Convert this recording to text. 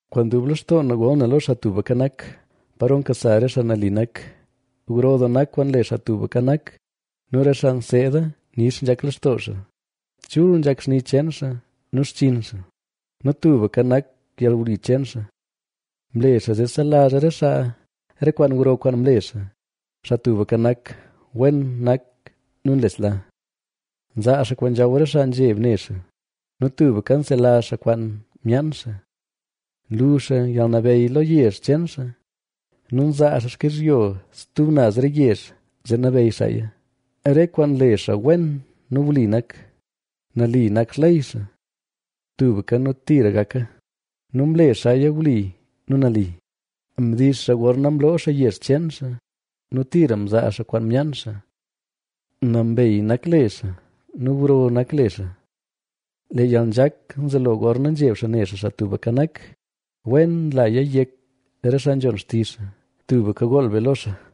Kwaan dub lextoo na gol na lo Xaa Tubka Nak, paro nkasa re xaa nali nak. Gro doo nak kwaan nle Xaa Tubka Nak nu re xaa nseeda nix nzhak lextoo xaa. Chul nzhak xni cheen xaa nu xchinn xaa nu tubka nak yalwli cheen xaa. Mle xaa zee selazh re xaa re kwaan gro kwaan mle xaa; Xaa Tubka Nak wen nak nu nlesla. Nzaa xaa kwaan nzhaw re xaa nzheb ne xaa nu tubka nselazh xaa kwaan myaan xaa. Nlu xaa yalnabeyy lo yezh cheen xaa nu nzaa xaa xkizhyo stub naz re yezh zee nabeyy xaaya. Re kwaan nle xaa wen nu wli nak; nali nak xley xaa. Tubka nu tira gaka nu mle xaaya wli nu nali, Mdix xaa gorna mloo xaa yezh cheen xaa nu tira mzaa xaa kwaan myaan xaa. Nambey nak le xaa nu gro nak le xaa. Lee yalnzhak nzelo gorna nzheb xaa ne xaa Xaa Tubka Nak; wen nlaya yek re xaa nzhon xtizh xaa. ¡Tubka gool be lo xaa!